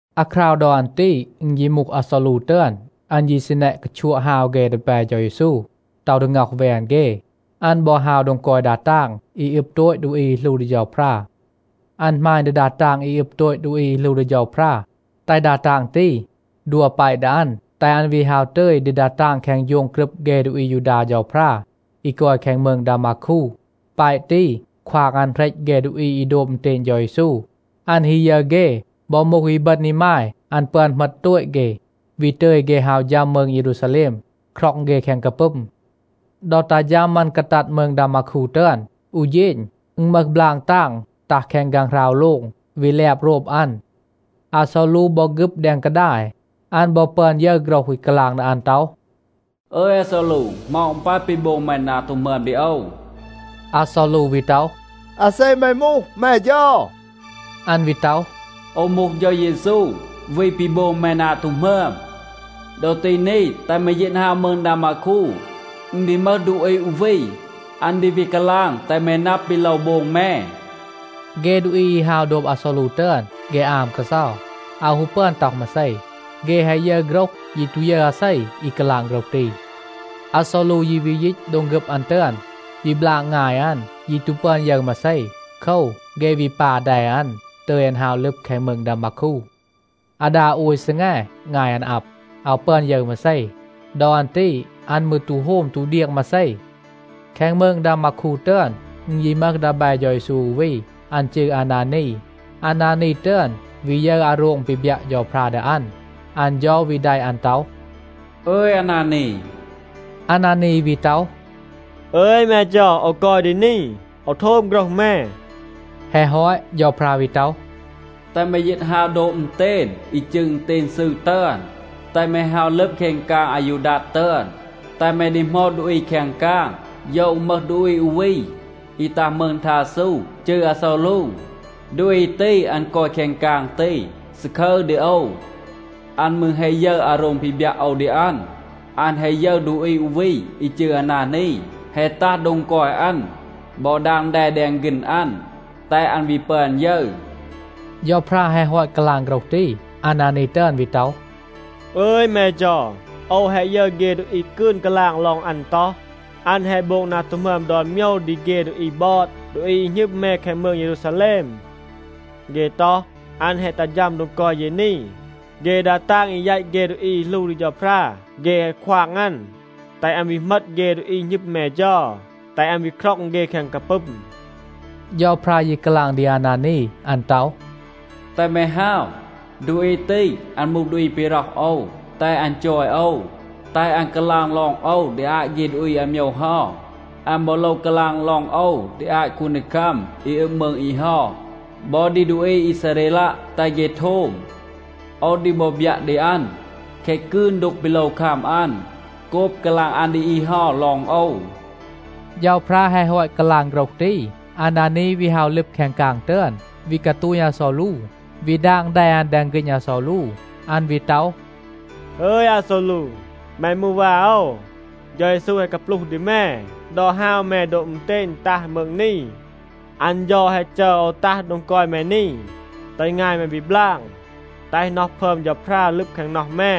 อาคราว ดอ อัน ตี อึณ ยี มูห อาซอลู ตึอน. อัน ยี ซี แนะ กาชัวะ ฮาว เฆ ดีแบ เฌา เยซู, ต็อห ดี ง็อห แวน เฆ. อัน บอ ฮาว โดง กอย ดา ตาง อี อึบ โตต ดูอี อี หลู ดี เฌาพรา. อัน หมาณ ดี ดา ตาง อี อึบ โตต ดูอี อี หลู ดี เฌาพรา, แตห ดา ตาง ตี ดัว แปะ ดี อัน, แตห อัน วี ฮาว ตึย ดี ดา ตาง แคง โฌง กรึบ เฆ ดูอี อายูดา เฌาพรา อี กอย แคง มืง ดามาคู. แปะ ตี ควาง อัน เหรต เฆ ดูอี อี โดบ อึณเตณ เฌา เยซู. อัน ฮี ยึร เฆ บอ มูห อีบึณ อีมาย, อัน ปึอน เหมต โตต เฆ, วี ตึย เฆ ฮาว ฌัม มืง เยรูซาแลม, คร็อง เฆ แคง กาปึม. ดอ ตัห ฌัม อัน กาตัด มืง ดามาคู ตึอน, อู เฌณ, อึณ มึห บลาง ตาง ตัห แคง ฆางหราว โลง, วี แลบ โรบ อัน. อาซอลู บอ ฆึบ แดง กาดาย, อัน บอ ปึอน ยึร โฆรห อี กาลาง ดี อัน ต็อห, “อึย อาซอลู, เหมา อึณ ปาย ปี โบง แม นา ตู หมึอม ดี โอว?” อาซอลู วี ต็อห, “อาเซ แม มูห, แม เฌา?” อัน วี ต็อห, “โอว มูห เฌา เยซู, วี ปี โบง แม นา ตู หมึอม. ดอ ตี นี, แตห แม ยีต ฮาว มืง ดามาคู. อึณ ดี มึห ดูอี อู วี, อัน ดี วี กาลาง แตห แม นับ ปี โลว โบง แม.” เฆ ดูอี อี ฮาว โดบ อาซอลู ตึอน, เฆ อาม กาเซา, อาว ฮู ปึอน ต็อห มาเซ. เฆ แฮะ ยึร โฆรห, ยี ตู ยึร อาเซ, อี กาลาง โฆรห ตี. อาซอลู ยี วี ยีต โดง ฆึบ อัน ตึอน, วี บลาง งาย อัน, ยี ตู ปึอน ยึร มาเซ. โคว, เฆ วี ปา แด อัน, ตึย อัน ฮาว ลึบ แคง มืง ดามาคู. อาดา โอย ซีแง งาย อัน อับ, อาว ปึอน ยึร มาเซ. ดอ อัน ตี อัน มืร ตู โฮม ตู เดียง มาเซ. แคง มืง ดามาคู ตึอน, อึณ ยี มึห ดีแบ เฌา เยซู อู วี. อัน จืร อานานี. อานานี ตึอน วี ยึร อาโรง ปี บยัะ เฌาพรา ดี อัน. อัน เฌา วี แดะ อัน ต็อห, “อึย, อานานี.” อานานี วี ต็อห, “อึย แม เฌา, โอว กอย ดี นี. โอว โทม โฆรห แม.” แฮะ ฮอต, เฌาพรา วี ต็อห, “แตห แม ยีต ฮาว โดบ อึณเตณ, อี จืร อึณเตณ ซืร ตึอน. แตห แม ฮาว ลึบ แคง กาง อายูดัด ตึอน. แตห แม ดีหมอด ดูอี แคง กาง, โยว อึณ มึห ดูอี อู วี, อี ตัห มืง ทาซู, จืร อาซอลู. ดูอี ตี, อัน กอย แคง กาง ตี, ซาคึร ดี โอว. อัน มืร แฮะ ยึร อาโรง ปี บยัะ โอว ดี อัน. อัน แฮะ ยึร ดูอี อู วี อี จืร อานานี, แฮะ ตัห โดง กอย อัน บอ ดาง แด แดง ฆีณ อัน, แตห อัน วี ปึอน ยึร.” เฌาพรา แฮะ ฮอต กาลาง โฆรห ตี, อานานี ตึอน วี ต็อห, “อึย แม เฌา, โอว แฮะ ยึร เฆ ดูอี กืน กาลาง ลอง อัน ต็อห, อัน แฮะ โบง นา ตู หมึอม ดอน โมยว ดี เฆ ดูอี บอด, ดูอี อี หณึม แม แคง มืง เยรูซาแลม. เฆ ต็อห, อัน แฮะ ตัห ฌัม โดง กอย เย นี. เฆ ดา ตาง อี แยต เฆ ดูอี อี หลู ดี เฌาพรา เฆ แฮะ ควาง อัน, แตห อัน วี เหมต เฆ ดูอี หณึม แม เฌา, แตห อัน วี คร็อง เฆ แคง กาปึม.” เฌาพรา ยี กาลาง ดี อานานี. อัน ต็อห, “แตห แม ฮาว. ดูอี ตี, อัน มูห ดูอี ปี ร็อห โอว, แตห อัน จอย โอว, แตห อัน กาลาง ลอง โอว ดี อาต เฆ ดูอี อาโมยว เฮา. อัน บอ โลว กาลาง ลอง โอว ดี อาต คูนดีคัม อี อึบ มืง อี เฮา บอ ดี ดูอี อีซาเรลัะ, แตห เฆ โทม. โอว ดี บอ บยัะ ดี อัน, แคะ กืน ดูก ปี โลว คัม อัน โกบ กาลาง อัน ดี อี เฮา ลอง โอว.” เฌาพรา แฮะ ฮอต กาลาง โฆรห ตี, อานานี วี ฮาว ลึบ แคง กาง ตึอน, วี กาตูณ อาซอลู, วี ดาง แด อัน แดง ฆีณ อาซอลู. อัน วี ต็อห, “อึย อาซอลู, แม มูห วา โอว. เฌา เยซู แฮะ กาปลูห ดี แม ดอ ฮาว แม โดบ อึณเตณ, ตัห มืง นี. อัน เฌา แฮะ จัร โอว ตัห โดง กอย แม นี, แตห งาย แม วี บลาง, แตห น็อห พึอม เฌาพรา ลึบ แคง น็อห แม.”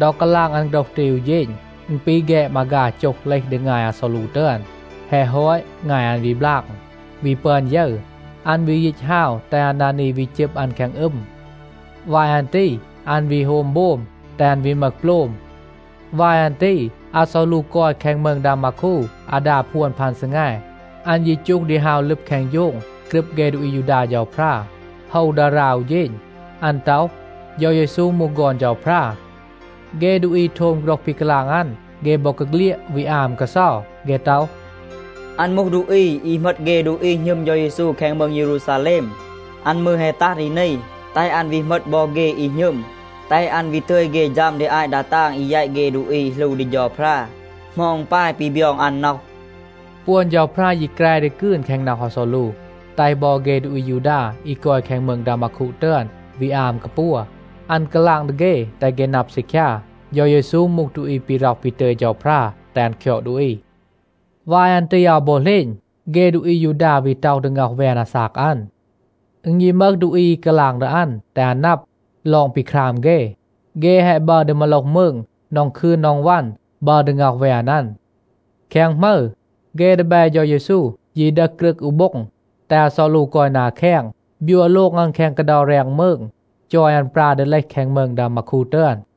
ดอ กาลาง อัน โฆรห ตี อู เฌณ, อึณ ปี แฆด มาฆา โจห เลห ดี งาย อาซอลู ตึอน. แฮะ ฮอต, งาย อัน วี บลาง, วี ปึอน ยึร. อัน วี ยีต ฮาว, แตห อานานี วี จึบ อัน แคง อึม. วาย อัน ตี อัน วี โฮม โบม, แตห อัน วี มึห โปลม. วาย อัน ตี อาซอลู กอย แคง มืง ดามาคู อาดา พวน พัน ซีแง. อัน ยี จูห ดี ฮาว ลึบ แคง โฌง กรึบ เฆ ดูอี อายูดา เฌาพรา, โฮว ดารา อู เฌณ. อัน ต็อห, เฌา เยซู มูห ฆอน เฌาพรา. เฆ ดูอี โทม โฆรห ปี กาลาง อัน, เฆ บอกาเฆลียด วี อาม กาเซา. เฆ ต็อห, “อัน มูห ดูอี อี เหมต เฆ ดูอี หณึม เฌา เยซู แคง มืง เยรูซาแลม. อัน มืร แฮะ ตัห ดี นี, แตห อัน วี เหมต บอ เฆ อี หณึม, แตห อัน วี ตึย เฆ ฌัม ดี อาต เฆ ดา ตาง อี แยต เฆ ดูอี อี หลู ดี เฌาพรา. เหมา อึณ ปาย ปี บยอง อัน น็อห?” ปวน เฌาพรา ยี แฮะ แกร ดี กืน แคง น็อห อาซอลู, แตห บอ เฆ ดูอี อายูดา อี กอย แคง มืง ดามาคู ตึอน วี อาม กาปัว. อัน กาลาง ดี เฆ, แตห เฆ นับ ซีคยา, เฌา เยซู มูห ดูอี ปี ร็อห ปี ตึย เฌาพรา แตห อัน คยอด ดูอี. วาย อัน ตี อาว บอ เหลณ, เฆ ดูอี อายูดา วี ต็อห ดี ง็อห แวน อาซาก อัน. อึณ ยี มึห ดูอี อี กาลาง ดี อัน, แตห อัน นับ ลอง ปี คราม เฆ. เฆ แฮะ บัร ดี มาโลห มืง นอง คืน นอง วัน, บัร ดี ง็อห แวน อัน. แคง หมึร, เฆ ดีแบ เฌา เยซู ยี ดึห กรึก อู โบ็ง, แตห อาซอลู กอย นา แคง, บยัว โลง อัน แคง กาเดา แรง มืง, จอย อัน ปรา ดี เลห แคง มืง ดามาคู ตึอน.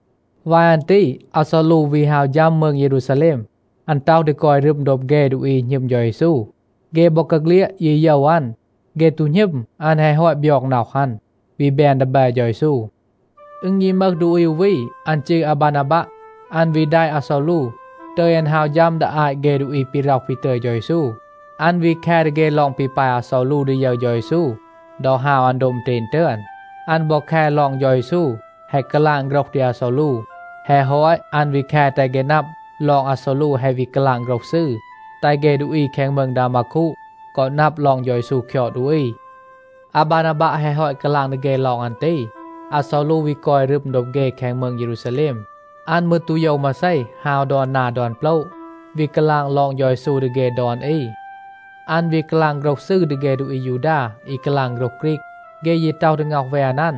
วาย อัน ตี อาซอลู วี ฮาว ฌัม มืง เยรูซาแลม. อัน ต็อห ดี กอย รึม โดบ เฆ ดูอี อี หณึม เฌา เยซู. เฆ บอกาเฆลียด ยี โยว อัน. เฆ ตู หณึม อัน แฮะ ฮอต บยอง น็อห อัน, วี แบน ดีแบ เฌา เยซู. อึณ ยี มึห ดูอี อู วี, อัน จืร อาบานาบัะ. อัน วี แดะ อาซอลู, ตึย อัน ฮาว ฌัม ดี อาต เฆ ดูอี ปี ร็อห ปี ตึย เฌา เยซู. อัน วี แค ดี เฆ ลอง ปี ปาย อาซอลู ดี ยึร เฌา เยซู ดอ ฮาว อัน โดบ อึณเตณ ตึอน. อัน บอ แค ลอง เฌา เยซู แฮะ กาลาง โฆรห ดี อาซอลู. แฮะ ฮอต, อัน วี แค แตห เฆ นับ ลอง อาซอลู แฮะ วี กาลาง โฆรห ซืร, แตห เฆ ดูอี แคง มืง ดามาคู กอ นับ ลอง เฌา เยซู คยอด ดูอี. อาบานาบัะ แฮะ ฮอต กาลาง ดี เฆ ลอง อัน ตี, อาซอลู วี กอย รึม โดบ เฆ แคง มืง เยรูซาแลม. อัน มืร ตู โยว มาเซ, ฮาว ดอน นา ดอน โปละ, วี กาลาง ลอง เฌา เยซู ดี เฆ ดอน อี. อัน วี กาลาง โฆรห ซืร ดี เฆ ดูอี อายูดา อี กาลาง โฆรห ฆรีก. เฆ ยี ต็อห ดี ง็อห แวน อัน.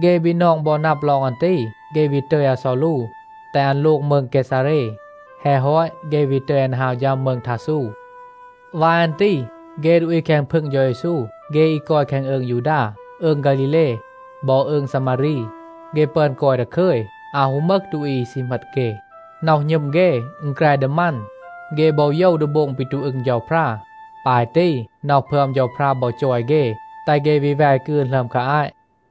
เฆ บีนอง บอ นับ ลอง อัน ตี, เฆ วี ตึย อาซอลู, แตห อัน โลง มืง เกซาเร. แฮะ ฮอต, เฆ วี ตึย อัน ฮาว ฌัม มืง ทาซู. วาย อัน ตี เฆ ดูอี แคง พึง เฌา เยซู, เฆ อี กอย แคง อืง ยูดา, อืง ฆาลีเล บอ อืง ซามารี, เฆ ปึอน กอย ดาคึย, อาว ฮู มึห ดูอี อี ซี เหมต เฆ. น็อห หณึม เฆ, อึณ แกร ดี มัน, เฆ บอ โยว ดี โบง ปี ตู อึง เฌาพรา. ปาย ตี น็อห พึอม เฌาพรา บอ จอย เฆ, แตห เฆ วี แว กืน หลึอม คา อาต.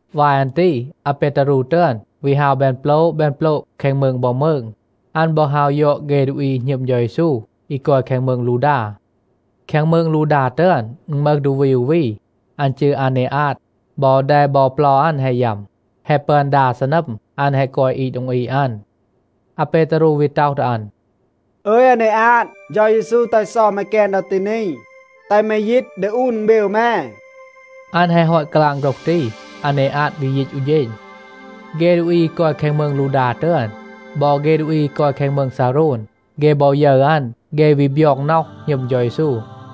วาย อัน ตี อาเปตารู ตึอน วี ฮาว แบน โปละ แบน โปละ แคง มืง บอ มืง. อัน บอ ฮาว ยอด เฆ ดูอี อี หณึม เฌา เยซู, อี กอย แคง มืง ลูดา. แคง มืง ลูดา ตึอน, อึณ มึห ดูอี อู วี. อัน จืร อาเนอาด. บอ แด บอ เปลา อัน แฮะ ยัม. แฮะ ปึอน ดา ซีนัม อัน แฮะ กอย อีด โดง อีด อัน. อาเปตารู วี ต็อห ดี อัน, “อึย อาเนอาด, เฌา เยซู แตห เซา แม แกน ดอ ตี นี. แตห แม ยีต ดึห อูน อึณเบว แม.” อัน แฮะ ฮอต กาลาง โฆรห ตี, อาเนอาด วี ยีต อู เฌณ. เฆ ดูอี อี กอย แคง มืง ลูดา ตึอน บอ เฆ ดูอี อี กอย แคง มืง ซาโรน, เฆ บอ ยึร อัน, เฆ วี บยอง น็อห, หณึม เฌา เยซู.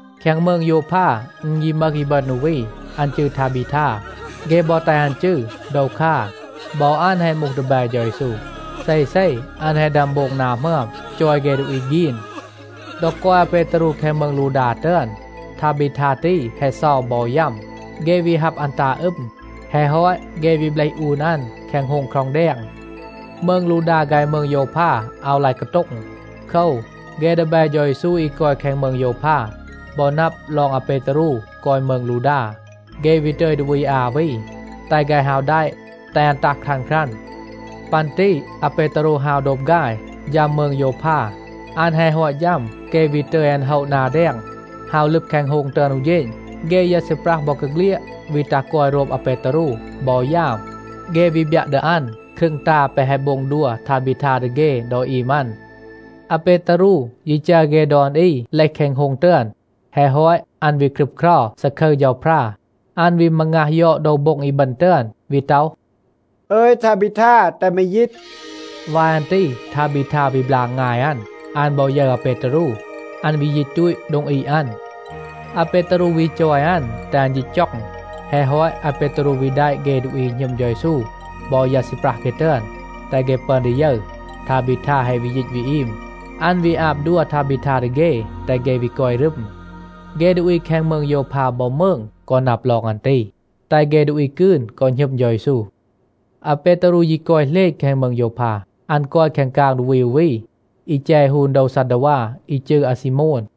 แคง มืง โยวพา อึณ ยี มึห อีบึณ อู วี, อัน จืร ทาบีทา. เฆ บอ แตห อัน จืร โดวคา. บอ อัน แฮะ มูห ดีแบ เฌา เยซู. เซเซ อัน แฮะ ดึอม โบง นา หมึอม, จอย เฆ ดูอี ฆีน. ดอ กอย อาเปตารู แคง มืง ลูดา ตึอน, ทาบีทา ตี แฮะ เซา บอ ยัม. เฆ วี ฮับ อัน ตา อึม. แฮะ ฮอต, เฆ วี เบลห อูน อัน แคง โฮง คร็อง แดง. มืง ลูดา ฆาย มืง โยวพา อาว ลาย กาโต็ง. โคว, เฆ ดีแบ เฌา เยซู อี กอย แคง มืง โยวพา บอ นับ ลอง อาเปตารู กอย มืง ลูดา, เฆ วี ตึย ดูอี อา วี, แตห ฆาย ฮาว แดะ, แตห อัน ตัห ครัน ครัน. ปัน ตี อาเปตารู ฮาว โดบ ฆาย, ฌัม มืง โยวพา. อัน แฮะ ฮอต ฌัม, เฆ วี ตึย อัน โฮะ นา แดง ฮาว ลึบ แคง โฮง ตึอน อู เฌณ. เฆ ยา ซีปรัห บอกาเฆลียด, วี ตัห กอย โรบ อาเปตารู บอ ยาม. เฆ วี บยัะ ดี อัน ครึง ตา แปะ แฮะ โบง ดัว ทาบีทา ดี เฆ ดอ อีม อัน. อาเปตารู ยี จัร เฆ ดอน อี เลห แคง โฮง ตึอน. แฮะ ฮอต, อัน วี ครึบเครา, ซาคึร เฌาพรา. อัน วี มางัห ยอด โดว โบ็ง อีบึณ ตึอน, วี ต็อห, “อึย ทาบีทา, แตห แม ยีต.” วาย อัน ตี ทาบีทา วี บลาง งาย อัน. อัน บอ ยึร อาเปตารู, อัน วี ยีต ตูต โดง อีด อัน. อาเปตารู วี จอย อัน แตห อัน ยีต จ็อง. แฮะ ฮอต, อาเปตารู วี แดะ เฆ ดูอี หณึม เฌา เยซู บอ ยา ซีปรัห เฆ ตึอน, แตห เฆ ปึอน ดี ยึร, ทาบีทา แฮะ วี ยีต วี อีม. อัน วี อาบ ดัว ทาบีทา ดี เฆ, แตห เฆ วี กอย รึม. เฆ ดูอี แคง มืง โยวพา บอ มืง กอ นับ ลอง อัน ตี, แตห เฆ ดูอี กืน กอ หณึม เฌา เยซู. อาเปตารู ยี กอย เหลณ แคง มืง โยวพา. อัน กอย แคง กาง ดูอี อู วี, อี แจ ฮูน โดว ซัดดาวา อี จืร อาซีโมน.